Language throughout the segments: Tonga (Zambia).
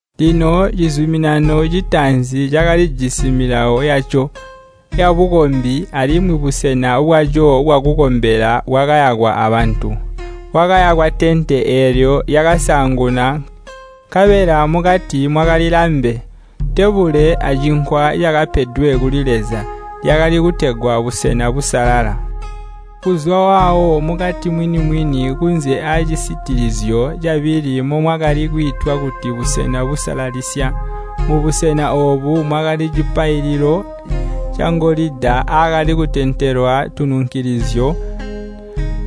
Lino cizuminano citaanzi cakalijisi milawo yaco yabukombi alimwi busena bwaco bwakukombela bwakayakwa abantu. Kwakayakwa tente eelyo lyakasaanguna nkabela mukati mwakali lambe, tebule acinkwa cakapedwe kuli Leza. Lyakali kutegwa busena busalala. Kuzwa waawo mukati mwini-mwini kunze aacisitilizyo cabili momwakali kwiitwa kuti busena busalalisya. Mubusena oobu mwakali cipaililo cangolida aakali kutentelwa tununkilizyo,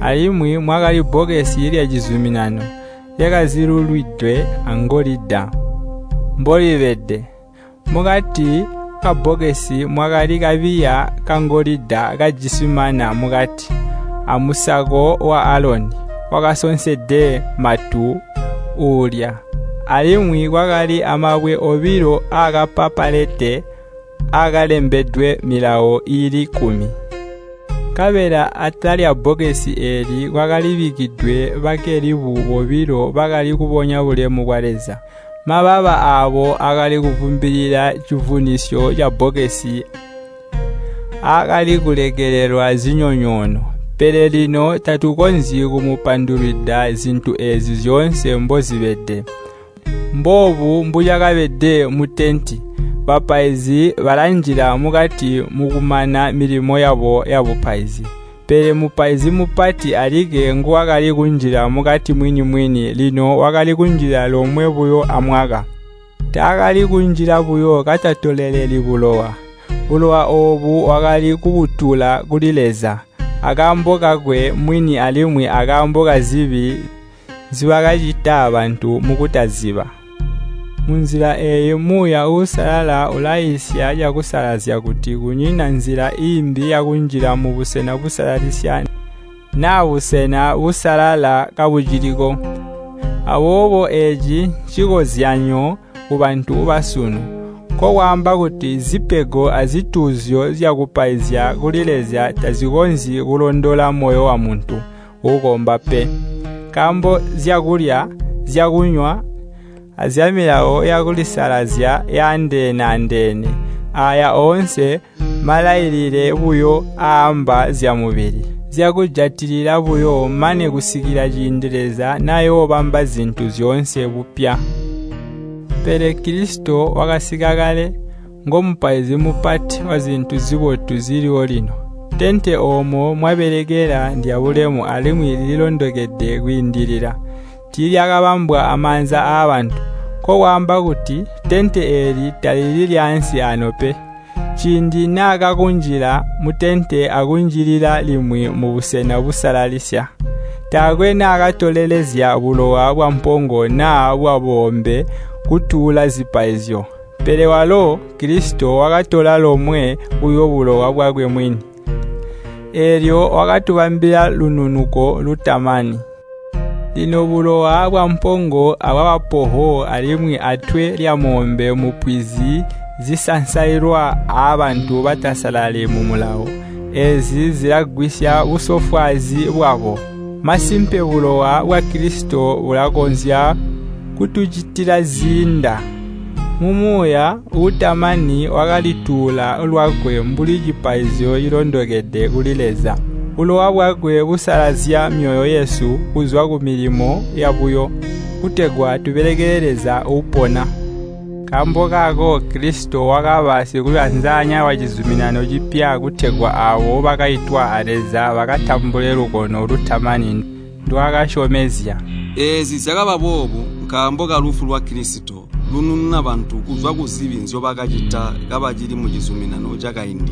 alimwi mwakali bbokesi lya cizuminano, lyakazilulwidwe angolida mbolibede. Mukati kabbokesi mwakali kabiya kangolida kajisi mana mukati, amusako wa Aloni wakasonsede matu uulya, alimwi kwakali amabwe obilo aakapapalete aakalembedwe milawo iili kkumi. Nkabela atala lyabbokesi eeli kwakalibikkidwe bakelibu bobilo bakali kubonya bulemu bwa Leza. Mababa aabo akali kuvumbilila civunisyo cabbokesi aakalikulekelelelwa zinyonyoono. Pele lino tatukonzyi kumupandulwida zintu eezi zyoonse mbozibede. Mboobu mbucakabede mutente. Bapaizi balanjila mukati mukumana milimo yabo yabupaizi. Pele Mupaizi Mupati alikke nguwakali kunjila mukati mwini-mwini, lino wakali kunjila lomwe buyo amwaka. Taakali kunjila buyo katatoleleli bulowa. Bulowa oobo wakali kubutuula kuli Leza akaambo kakwe mwini alimwi akaambo kazibi nzibakacita bantu mukutaziba. Munzila eeyi Muuya Uusalala ulaiisya cakusalazya kuti kunyina nzila iimbi yakunjila mu Busena Busalalisya naa Busena Busalala kabuciliko. Aboobo eeci ncikozyanyo kubantu basunu. Nkokwaamba kuti zipego azituuzyo zyakupaizya kuli Leza tazikonzyi kulondola moyo wamuntu uukomba pe. Nkaambo nzyakulya, zyakunywa, azyamilawo yakulisalazya yaandeene-andeene. Aaya oonse mmalailile buyo aaamba zyamubili, zyakujatilila buyo mane kusikila ciindi Leza nayoobamba zintu zyoonse bupya. Pele Kilisito wakasika kale, ngo Mupaizi Mupati wazintu zibotu ziliwo lino. Tente oomo mwabelekela ndyabulemu alimwi lililondokede kwiindilila. Tiilyakabambwa amaanza aabantu, nkokwaamba kuti, tente eeli talili lyaansi aano pe. Ciindi naakaakunjila mutente akunjilila limwi mubusena busalalisya, taakwe naakatolelezya bulowa bwampongo naa bwaboombe kutuula zipaizyo, pele walo (Kilisito) wakatola lomwe buyo bulowa bwakwe mwini, eelyo wakatubambila lununuko lutamani. Lino bulowa bwampongo abwabapoho alimwi atwe lyamoombe mupwizi zisansailwa aabantu batasalali mumulawo. Eezi zilagwisya busofwaazi bwabo. Masimpe bulowa bwa Kilisito bulakonzya kutucitila ziinda! Mu Muuya uutamani wakalituula lwakwe mbuli cipaizyo cilondokede kuli Leza. Bulowa bwakwe busalazya myoyo yesu kuzwa kumilimo yabuyo, kutegwa tubelekele Leza Uupona. Nkaambo kaako Kilisito wakaba Sikuyanzanya wacizuminano cipya kutegwa aabo bakaitwa a Leza bakatambule lukono lutamani ndwaakasyomezya. Eezi zyakaba boobu nkaambo kalufu lwa Kilisito, lunununa bantu kuzwa kuzibi nzyobakacita kabacili mucizuminano cakaindi.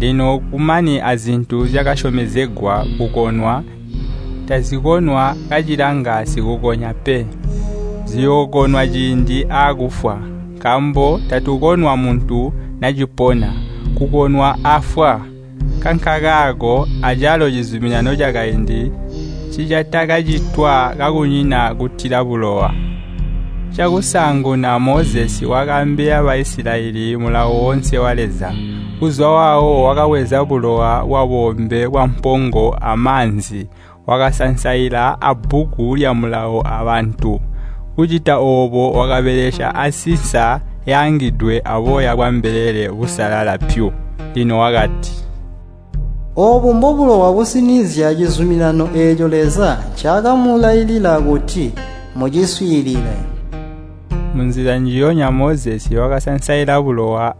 Lino kumakani azintu zyakasyomezegwa kukonwa, tazikonwa kacilanga sikukonya pe. Ziyookonwa ciindi aakufwa. Nkaambo takukonwa muntu nacipona, kukonwa afwa. Nkankakaako acalo cizuminano cakaindi ncicatakacitwa kakunyina kutila bulowa. Cakusaanguna Mozesi wakaambila Baisilayeli Mulawo woonse wa Leza. Kuzwa waawo wakabweza bulowa bwaboombe, bwampongo amaanzi, wakasansaila aabbuku lya Mulawo aabantu. Kucita oobu wakabelesya ansinsa yaangidwe aboya bwambelele busalala pyu. Lino wakati, “Oobu mbobulowa businizya cizuminano eeco Leza ncaakamulailila kuti muciswiilile.” Munzila njiyonya Mozesi wakasansaila bulowa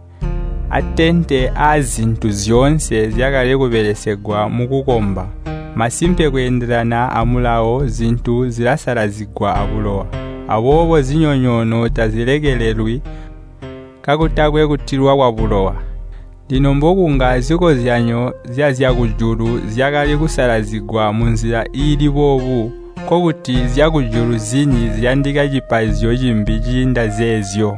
atente aazintu zyoonse zyakali kubelesegwa mukukomba. Masimpe, kweendelana a Mulawo, zintu zilasalazigwa abulowa. Aboobo zinyonyoono tazilekelelwi kakutakwe kutilwa kwabulowa. Lino mbokunga zikozyanyo zyazyakujulu zyakali kusalazigwa munzila iili boobu, nkokuti zyakujulu zini ziyandika cipaizyo cimbi ciinda zeezyo.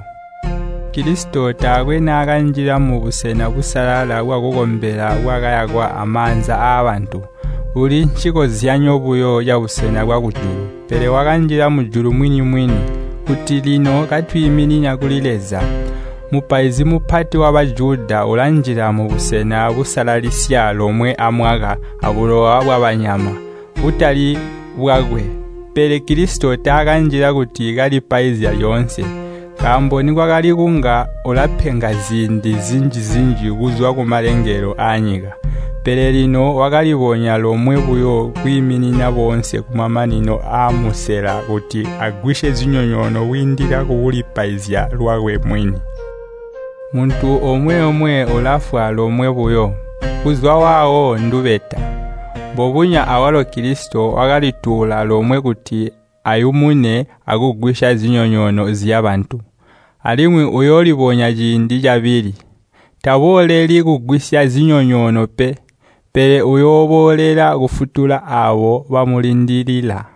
Kilisito taakwe naakanjila mubusena busalala bwakukombela bwakayakwa amaanza aabantu, buli ncikozyanyo buyo cabusena bwakujulu. Pele wakanjila mujulu mwini-mwini, kuti lino katwiiminina kuli Leza. Mupaizi Mupati wa Bajuda ulanjila mubusena busalalisya lomwe amwaka abulowa bwabanyama, butali bwakwe. Pele Kilisito taakanjila kuti kalipaizya lyoonse. Nkaambo nikwali kunga ulapenga ziindi zinji-zinji kuzwa kumalengelo aanyika. Pele lino wakalibonya lomwe buyo kwiiminina boonse kumamanino aamusela kuti agwisye zinyonyoono kwiindila kukulipaizya lwakwe mwini. Muntu omwe-omwe ulafwa lomwe buyo, kuzwa waawo ndubeta. Mbubonya awalo Kilisito wakalituula lomwe kuti ayumune akugwisya zinyonyoono zyabantu. Alimwi uyoolibonya ciindi cabili. Tabooleli kugwisya zinyonyoono pe, pele uyooboolela kufutula aabo bamulindilila.